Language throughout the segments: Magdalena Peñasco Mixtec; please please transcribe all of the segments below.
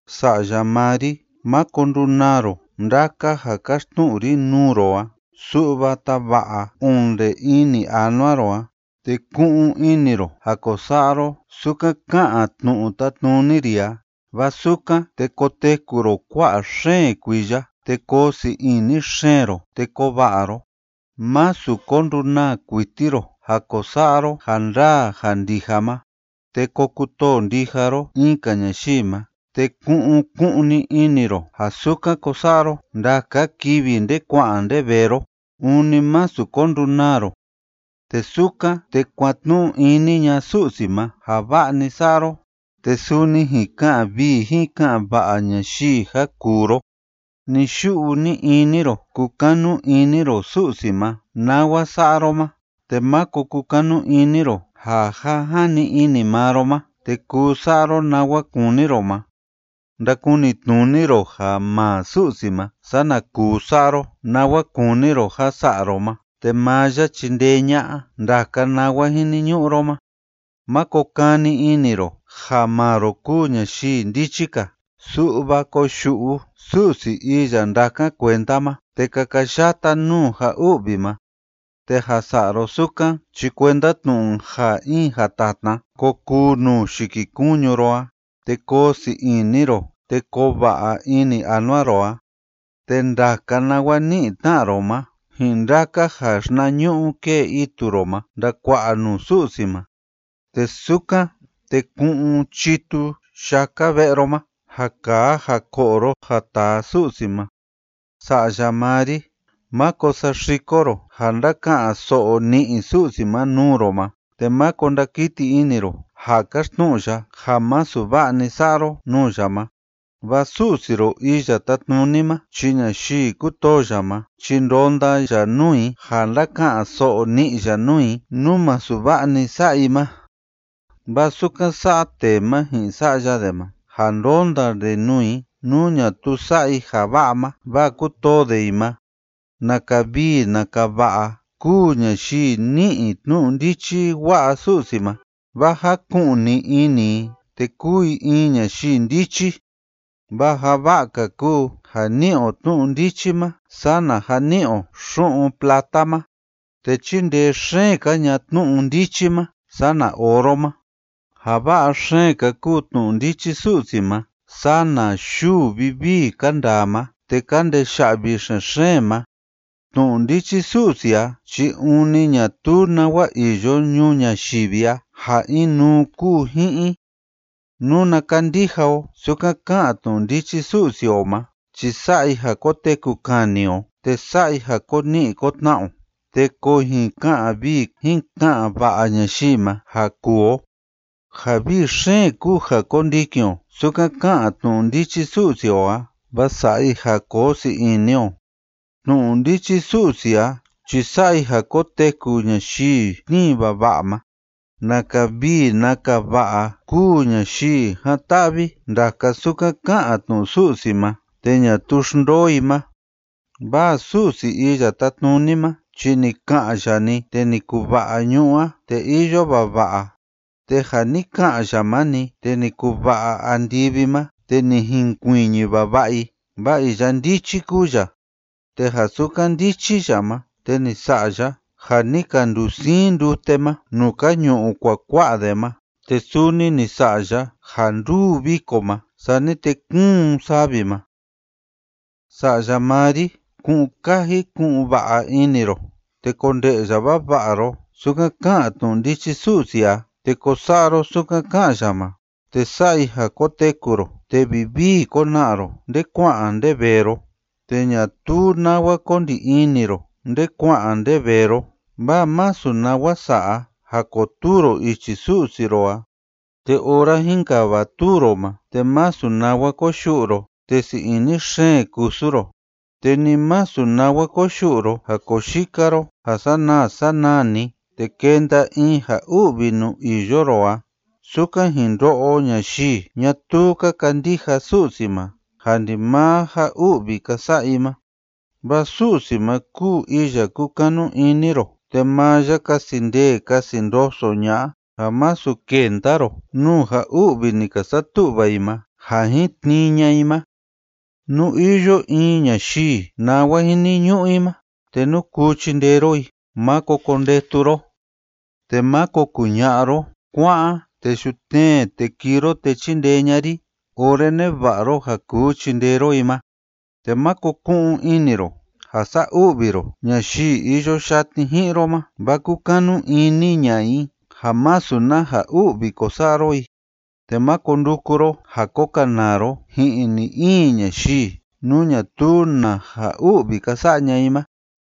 Sa'ya maa ri, máko ndunaa ro ndaka ja káxtnu'u ri nuu ro a, su'va tava'a onde ini anua ro a, te ku'un ini ro ja ko sa'a ro sukan ká'an tnu'u tátnuni ri a. Vaa sukan, te koteku ro kua'a xeen kuiya, te koo sii ini xeen ro, te koo va'a ro. Másu ko ndunaa kuiti ro ja ko sa'a ro ja ndaa ja ndija ma. Te ko kutoo ndija ro in‑ka ñayii ma, te ku'un ku'un‑ni ini ro ja sukan ko sa'a ro ndaka kivi nde kua'an nde vee ro. Ûni másu ko ndunaa ro. Te sukan, te kuatnu'u ini ña'a Su'si ma ja va'a‑ni sa'a ro, te suni jin ka'an vii jin ka'an va'a ñayii ja kuu ro. Ni‑yu'u ni‑ini ro kukanu ini ro Su'si ma nawa sa'a ro ma, te máko kukanu ini ro ja ja jani ini maa ro ma te kuu sa'a ro nawa kúni ro ma. Ndakunitnuni ro ja maa Su'si ma, sana kuu sa'a ro nawa kúni ro ja sa'a ro ma, te maa ya chindee ña'a ndaka nawa jiniñu'u ro ma. Máko kani ini ro ja maa ro kúu ñayii ndichi‑ka, su'va koyu'u Su'si iya ndákan kuenda ma, te kakayata nuu ja u'vi ma. Te ja sa'a ro sukan chi kuenda tnu'u ja in jatatna ko kuu nuu yikikuñu ro a, te koo sii ini ro, te koo va'a ini anua ro a. Te ndaka nawa ni'i tna'a ro ma ji'in ndaka ja xinañu'u kée itu ro ma ndakua'a nuu Su'si ma. Te sukan, te ku'un chitu yaka ve'e ro ma ja kaa ja ko'o ro ja taa Su'si ma. Sa'ya maa ri, máko saxiko ro ja ndáka'an so'o ni'i Su'si ma nuu ro ma, te máko ndakiti ini ro ja káxtnu'u ya ja masu va'a‑ni sa'a ro nuu ya ma. Vaa Su'si ro Iya Tátnuni ma chi ñayii kútoo ya ma chi ndonda ya nuu i ja ndáka'an so'o ni'i ya nuu i nú masu va'a‑ni sa'a i ma. Vaa sukan sa'a tee ma ji'in sa'ya de ma, ja ndónda de nuu i nú ñatuu sa'a i ja va'a ma, vaa kútoo de i ma. Naka vii naka va'a kúu ñayii ni'i tnu'u ndichi wa'a Su'si ma, vaa jáku'ni ini i te kúu i in ñayii ndichi. Vaa ja va'a‑ka kúu ja ni'i o tnu'u ndichi ma sana ja ni'i o xu'un plata ma. Te chíndee xeen‑ka ña'a tnu'u ndichi ma sana oro ma. Ja va'a xeen‑ka kúu tnu'u ndichi Su'si ma sana yuu vivii ka ndaa ma te ka ndeya'vi xen‑xeen ma. Tnu'u ndichi Su'si a chi ûni ñatuu nawa iyo ñuu ñayivi a ja inuu kúu ji'in i. Nuna kandija o sukan ká'an tnu'u ndichi Su'si o ma chi sa'a i ja koteku kani o; te sa'a i ja ko ni'i ko tna'a o te ko jin ka'an vii jin ka'an va'a ñayii ma ja kuu o. Ja vii xeen kúu ja kondikin o sukan ká'an tnu'u ndichi Su'si o a, vaa sa'a i ja koo sii ini o. Tnu'u ndichi Su'si a chi sa'a i ja koteku ñayii tnii vava'a ma. Naka vii naka va'a kúu ñayii jan‑ta'vi ndaka sukan ká'an tnu'u Su'si ma te ñatuu xndoo i ma. Vaa Su'si Iya Tátnuni ma chi ni ka'an ya‑ni, te ni kuva'a ñu'ú a te iyo vava'a. Te ja ni ka'an ya ma‑ni, te ni kuva'a andivi ma, te ni jinkuiñi vava'a i. Vaa iya ndichi kúu ya. Te ja sukan ndichi ya ma, te ni sa'a ya ja ni ka ndusiin ndute ma nuu ka ñu'u kuakua'a de ma. Te suni ni sa'a ya ja ndúu viko ma, sani te kúun savi ma. Sa'ya maa ri, ku'un kaji ku'un va'a ini ro, te konde'ya vava'a ro sukan ká'an tnu'u ndichi Su'si a, te ko sa'a ro sukan ká'an ya ma, te sa'a i ja koteku ro te vivii kona'a ro nde kua'an nde vee ro, te ñatuu nawa ko ndi ini ro nde kua'an nde vee ro, vaa masu nawa sa'a ja kotuu ro ichi Su'si ro a. Te ora jínkavatuu ro ma, te masu nawa koyu'u ro, te sii ini xeen kusu ro. Te ni masu nawa koyu'u ro ja koo yika ro ja sanaa sanaa‑ni, te kenda in ja u'vi nuu iyo ro a, sukan jin ndo'o ñayii ñatuu ka kandija Su'si ma ja ndimaa ja u'vi ka sa'a i ma. Vaa Su'si ma kúu iya kúkanu ini ro, te maa ya kasi ndee kasi ndoso ña'a ja masu kenda ro nuu ja u'vi ni ka satu'va i ma ja jin tnii ña'a i ma. Nú iyo in ñayii nawa jiniñu'u i ma te nú kuu chindee ro i, máko kondetu ro. Te máko kuña'a ro: “Kua'an, te yutnee te kii ro te chindee ña'a ri”, ora neva'a ro ja kuu chindee ro i ma. Te máko ku'un ini ro ja sa'a u'vi ro ñayii iyo yatni ji'in ro ma, vaa kúkanu ini ña'a i ja masu na ja u'vi ko sa'a ro i. Te máko nduku ro ja ko kanaa ro ji'in ni‑in ñayii, nú ñatuu na ja u'vi ka sa'a ña'a i ma.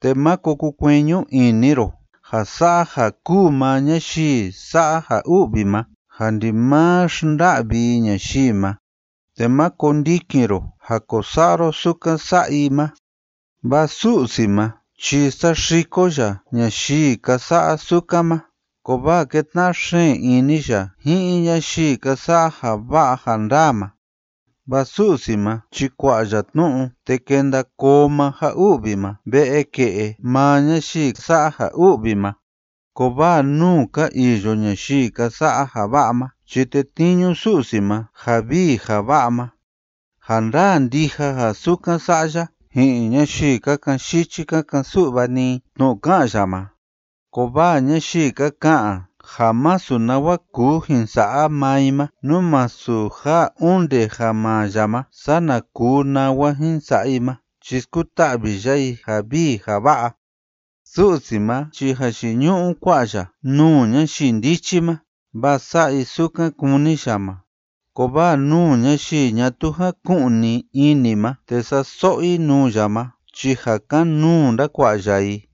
Te máko kukueñu ini ro ja sa'a ja kúu maa ñayii sa'a ja u'vi ma ja ndimaa xnda'vi i ñayii ma. Te má kondikin ro ja ko sa'a ro sukan sa'a i ma. Vaa Su'si ma chi saxiko ya ñayii ka sa'a sukan ma, kovaa kétna'a xeen ini ya ji'in ñayii ka sa'a ja va'a ja ndaa ma, Vaa Su'si ma chi kua'a ya tnu'u, te kenda koo maa ja u'vi ma ve'e ke'e maa ñayii sa'a ja u'vi ma. Kovaa nuu ka iyo ñayii ka sa'a ja va'a ma chi tetniñu Su'si ma ja vii ja va'a ma. Ja ndaa ndija ja sukan sa'a ya ji'in ñayii ka ka'an yichi ka ka'an su'va‑ni i tnu'u ká'an ya ma, kovaa ñayii ka ka'an ja masu nawa kuu jin sa'a maa i ma nú masu ja onde ja maa ya ma sana kuu nawa jin sa'a i ma chi skuta'vi ya i ja vii ja va'a. Su'si ma chi jayiñu'u kua'a ya nuu ñayii ndichi ma, vaa sa'a i sukan kúni ya ma. Kovaa nuu ñayii ñatuu jaku'ni ini ma te sa'a so'o i nuu ya ma chi ja kan‑nuu ndakua'a ya i.